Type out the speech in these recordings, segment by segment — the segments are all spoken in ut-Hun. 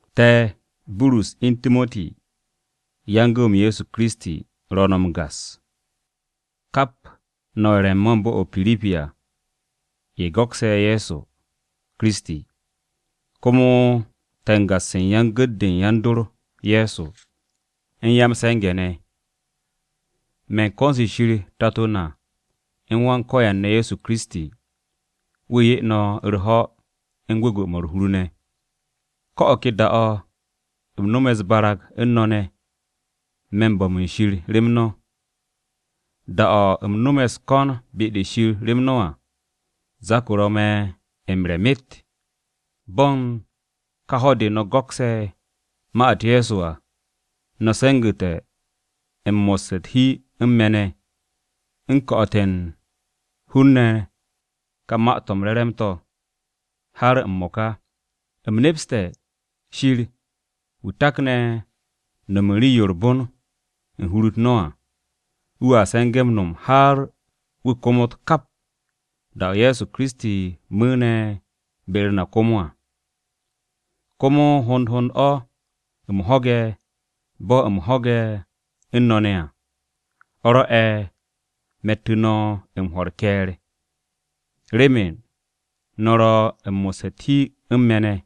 Me̱, Burus u̱n Timoti ne̱ yan-gu̱w-m Ye̱so Kiristi, ro̱ no̱ m-gas, kap no̱ ye̱ ro̱ n-me̱ u̱n bo̱-o̱ o-Piripi à, ye̱ go̱kse̱ Ye̱so Kiristi à. Komo te̱ m-gas u̱n yan-gu̱t-de u̱n yan-dor Ye̱so, u̱n yan-m-se̱nge̱ ne̱. Me̱ u̱n ko̱n-se Shir Tato na u̱n Wan-Ko̱yan ne̱ Ye̱so Kiristi, wu̱ 'ye no̱ u̱r-ho̱ u̱n gwu̱gwu̱-mo̱ u̱r-hur ne̱. Ko̱ o̱ ke da-o̱ u̱m no̱me̱ u̱s-barag u̱n no̱ ne̱, me̱ u̱n bo̱m u̱n Shir rem no̱. Da-o̱ u̱m no̱me̱ u̱s-ko̱n be-de Shir rem no̱ à, zak-o ro̱ me̱ m-re̱ myet. Bo̱ u̱n ka ho̱-de no̱ go̱kse̱ ma-u̱t Ye̱so à, no̱ se̱ngu̱te̱ m-mo̱sse̱ u̱t-hi u̱n me̱ ne̱, u̱n ko̱'o̱te̱ u̱n hun-ne̱ ka Ma-to̱ m-Re̱re̱m to̱ ne̱, har m-mo̱ka. U̱m nepse̱ Shir wu̱ takne̱ no̱m u̱n rii-yo u̱r-bon u̱n n-me̱ u̱n hur-u̱t no̱ à, wu̱a se̱nge̱ m-no̱m har wu̱ komot kap, da-o̱ Ye̱so Kiristi, mu̱u̱ne̱ be-u̱r na komo à. Komo hond hond o̱ u̱m ho̱ge̱ bo̱ u̱m ho̱ge̱ u̱n no̱ ne̱ à, o̱ rwo̱'e̱ me̱ttu̱ no̱ m-hwo̱ u̱r-ke̱e̱r, remen no̱ ro̱ u̱n mo̱sse̱ u̱t-hi u̱n me̱ ne̱,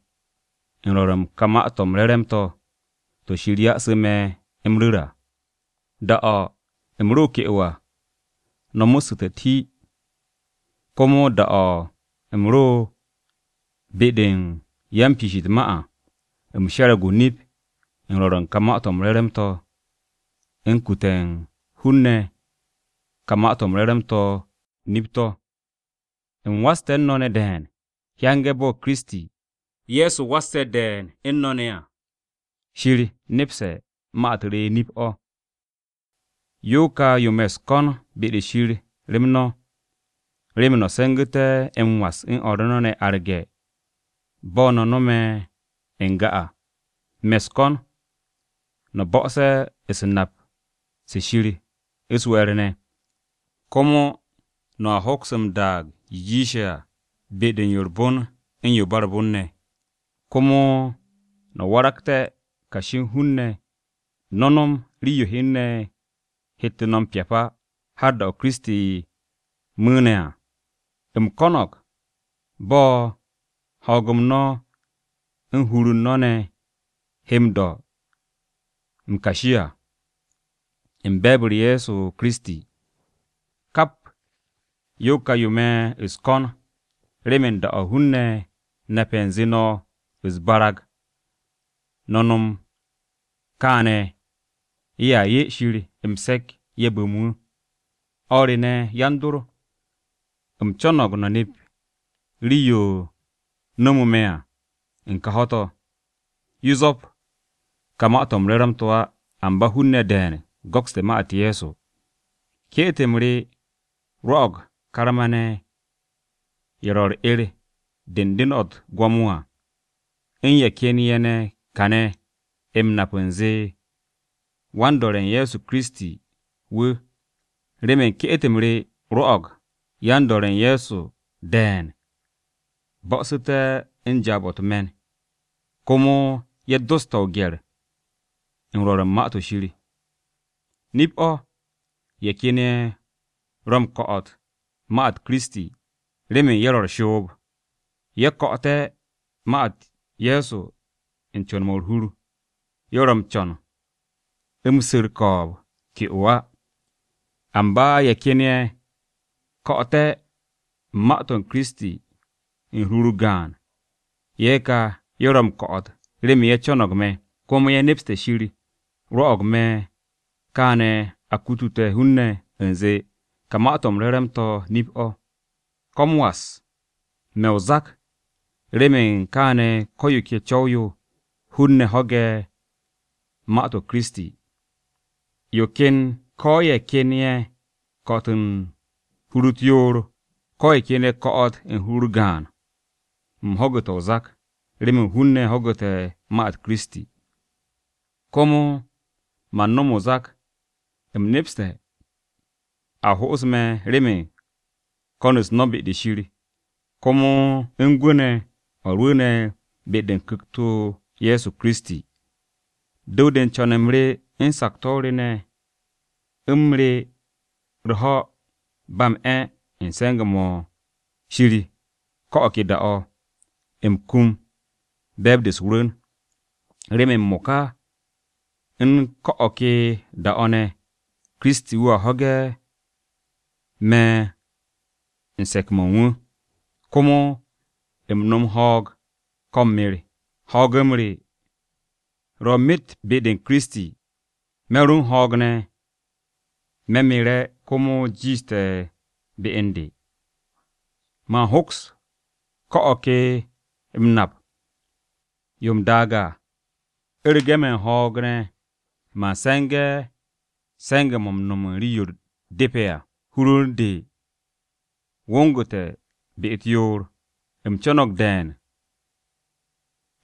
u̱n rwo̱r u̱n ka Ma-to̱ m-Re̱re̱m to̱, to̱ Shir ya'su̱ me̱ m-ru̱r à. Da-o̱ u̱m ro ke'o à, no̱ mo̱ssu̱te̱ u̱t-hi. Komo da-o̱ u̱m ro be-de u̱n yan-piish u̱t-ma à, u̱m she̱re̱g o-nip u̱n rwo̱r u̱n ka Ma-to̱ m-Re̱re̱m to̱ u̱n kute̱ u̱n hun-ne̱ ka Ma-to̱ m-Re̱re̱m to̱ nip-to̱. U̱m waste̱ u̱n no̱ ne̱ de̱e̱n, hyange̱ bo̱ Kiristi, Ye̱so wasse̱ de̱e̱n u̱n no̱ ne̱ à. Shir nepse̱ ma-u̱t re nip-o̱. Yo ka yo me̱ u̱s-ko̱n be-de Shir rem no̱, remen no̱ se̱ngu̱te̱ m-was u̱n o̱r no̱ ne̱ arge̱ bo̱ no̱ no̱me̱ n-ga à. Me̱ u̱s-ko̱n no̱ bo̱'o̱se̱ u̱s-nap se̱ Shir u̱s-we̱e̱r ne̱, komo no̱a hoks m-daag yo jiishe̱ à u̱n be-de yo u̱r-bon u̱n yo ba u̱r-bon ne̱. Komo no̱ waragté̱ kashi u̱n hun-ne̱, no̱ no̱m rii-yo hun-ne̱ hette̱ no̱ m-pyap á, har da-o̱ Kiristi, mu̱u̱ne̱ à. U̱m ko̱no̱g bo̱ ho̱o̱g-m no̱ u̱n hur-u̱r no̱ ne̱ he m-do̱ m-kashi à, u̱n be̱e̱b-u̱r Ye̱so Kiristi, kap yo ka yo me̱ u̱s-ko̱n remen da-o̱ hun-ne̱ nape̱ u̱nze no̱ u̱s-barag no̱ no̱m kaane̱, ye̱a 'ye Shir m-se̱k, ye̱ bu̱m wu̱. O̱r re ne̱, yan-dor, u̱m co̱no̱g no̱ nep rii-yo no̱mu̱ me̱ à u̱n ka ho̱-to̱, yo zwo̱p ka Ma-to̱ m-Re̱re̱m to̱ á, amba hun-ne̱ de̱e̱n go̱kste̱ ma-u̱t Ye̱so. Ke'et-m re rwo̱'o̱g karma-ne̱, ye̱ ro̱ u̱r-'er de u̱n den-o̱ u̱t-gwo̱mo à, u̱n ye̱ ken ye̱ ne̱ kane̱ m-nap u̱nze me̱ wan-do̱re̱ u̱n Ye̱so Kiristi wu̱. Remen ke'et-m re, rwo̱'o̱g yan-dor Ye̱so de̱e̱n bo̱'o̱su̱te̱ u̱n jaab-o̱ u̱t-me̱n. Komo ye̱ doste̱ o-gye̱r u̱n rwo̱r u̱n Ma-to̱ Shir. Nip-o̱, ye̱ ken ye̱ ro̱ m-ko̱'o̱t u̱n ma-u̱t Kiristi, remen ye̱ ro̱ u̱r-shoob. Ye̱ ko̱'o̱te̱ ma-u̱t Ye̱so u̱n co̱n-mo̱ u̱r-hur, ye̱ ro̱ m-co̱n u̱m su̱ u̱r-ko̱o̱b ke'o à. Amba ye̱ ken ye̱ ko̱'o̱tte̱ ma-u̱t Kiristi, u̱n hur-u̱r gaan, ye̱ ka, ye̱ ro̱ m-ko̱'o̱t remen ye̱ co̱no̱g me̱, komo ye̱ nepste̱ Shir rwo̱'o̱g me̱ kaane̱ a kutute̱ hun-ne̱ u̱nze ka Ma-to̱ m-Re̱re̱m to̱ nip-o̱. Ko̱ m-was! Me̱ o-zak remen kaane̱ ko̱ yo ke co̱w-yo, hun-ne̱ ho̱ge̱ ma-u̱t Kiristi. Ko ye̱ ken ye̱ ko̱'o̱t u̱n hur-u̱t yoor, ko ye̱ ken ye̱ ko̱'o̱t u̱n hur-u̱r gaan, u̱m ho̱gu̱te̱ o-zak, remen hun-ne̱ ho̱gu̱te̱ ma-u̱t Kiristi. Komo man no̱m o-zak, u̱m nepse̱ a ho'osu̱ me̱ remen ko̱n-u̱s no̱ be-de Shir, komo u̱n gwu̱ ne̱ o̱ rwu̱u̱ne̱ be-de u̱n Ku̱kt-o Ye̱so Kiristi à. Du̱w-de u̱n co̱n-m re u̱n sakto̱ re ne̱ u̱m re̱ u̱r-ho̱ ba m-'e̱ u̱n se̱nge̱-mo̱ Shir ko̱ o̱ ke da-o̱, u̱m kum be̱e̱b-de u̱s-rwu̱n, remen m-mo̱ka u̱n ko̱ o̱ ke da-o̱ ne̱, Kiristi wu̱a ho̱ge̱ me̱ u̱n se̱k-mo̱ u̱n wu̱, ko̱ u̱m no̱m ho̱o̱g, ko u̱m mer. Ho̱o̱g-m re ro̱ myet be-u̱t Kiristi, me̱ ro̱ u̱n ho̱o̱g ne̱, me̱ mere̱, komo jiishte̱ be u̱n de. Man hoks o̱ ka m-nap yo m-daag á. U̱rege̱ me̱ u̱n ho̱o̱g ne̱, man se̱nge̱ se̱nge̱-mo̱ m-no̱m u̱n rii-yo depe̱ à. Hur-u̱r u̱n de wo̱ngu̱te̱ be-u̱t yoor. U̱m co̱no̱g de̱e̱n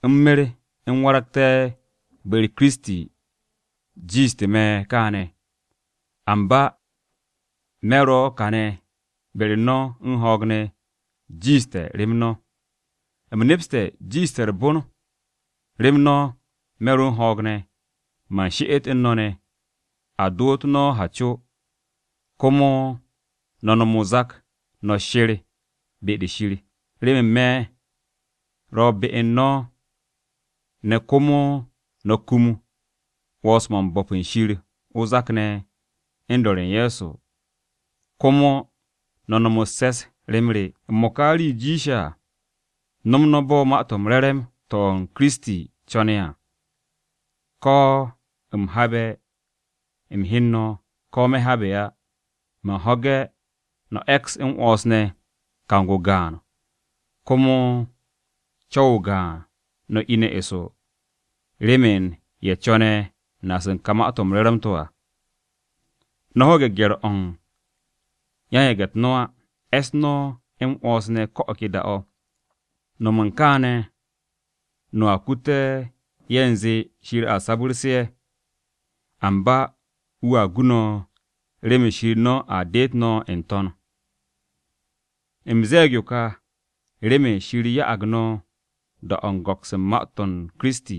u̱m mer u̱m waragte̱ be-u̱r Kiristi jiishte̱ me̱ kaane̱. Amba me̱ ro kane̱ be-u̱r no̱ u̱n ho̱o̱g ne̱ jiishte̱ rem no̱. U̱m nepse̱ jiishte̱ u̱r-bon rem no̱ me̱ ro̱ u̱n ho̱o̱g ne̱, man she'et u̱n no̱ ne̱, a doto no̱ ha co, komo no̱ no̱m o-zak, no̱ she̱r be-de Shir, remen me̱ ro be u̱n no̱ ne̱ komo no̱a kum 'wo̱ns-mo̱ u̱n bo̱p u̱n Shir o-zak ne̱ u̱n do̱re̱ u̱n Ye̱so Kiristi ne̱, komo no̱ nom u̱s-se̱s rem re. M-mo̱ka rii-yo jiishe̱ à, no̱m no̱ bo̱ Ma-to̱ m-Re̱re̱m to̱ ma Kiristi, co̱ne̱ à, ko̱ u̱m habe̱ m-hyen no̱, ko̱ me̱ habe̱ á, man ho̱ge̱ no̱ e̱ks m-'wo̱ns ne̱, kang-o gaan, komo co̱w-o gaan no̱ ine̱ eso remen ye̱ co̱ne̱ naas u̱n ka Ma-to̱ m-Re̱re̱m to̱ à. No̱ ho̱ge̱ gye̱r-o̱ u̱n yan-yage̱-u̱t no̱ á. E̱s no̱ m-'wo̱ns ne̱ ko̱ o̱ ke da-o̱. No̱m u̱n kaane̱, no̱a kute̱ ye̱ u̱nze Shir a sabu̱rse̱ ye̱. Amba wu̱a gu no̱ remen Shir no̱ a deet no̱ n-to̱n. U̱m ze̱e̱g yo ka, remen Shir ya'ag no̱ da-o̱ u̱n go̱ks u̱n ma-u̱t Kiristi,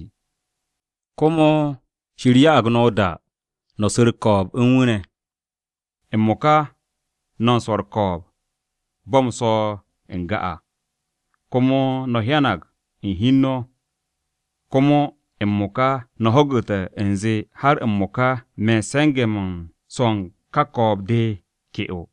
komo Shir ya'ag no̱ o-da no̱ su̱ u̱r-ko̱o̱b u̱n wu̱ ne̱. M-mo̱ka no̱ u̱n swo̱ u̱r-ko̱o̱b, bo̱ u̱m swo̱o̱ n-ga à, komo no̱ hyanag u̱n hi u̱n no̱. Komo m-mo̱ka no̱ ho̱gu̱te̱ u̱nze har m-mo̱ka me̱ u̱n se̱nge̱-mo̱ u̱n swo̱o̱ u̱n ka ko̱o̱b-de ke'o.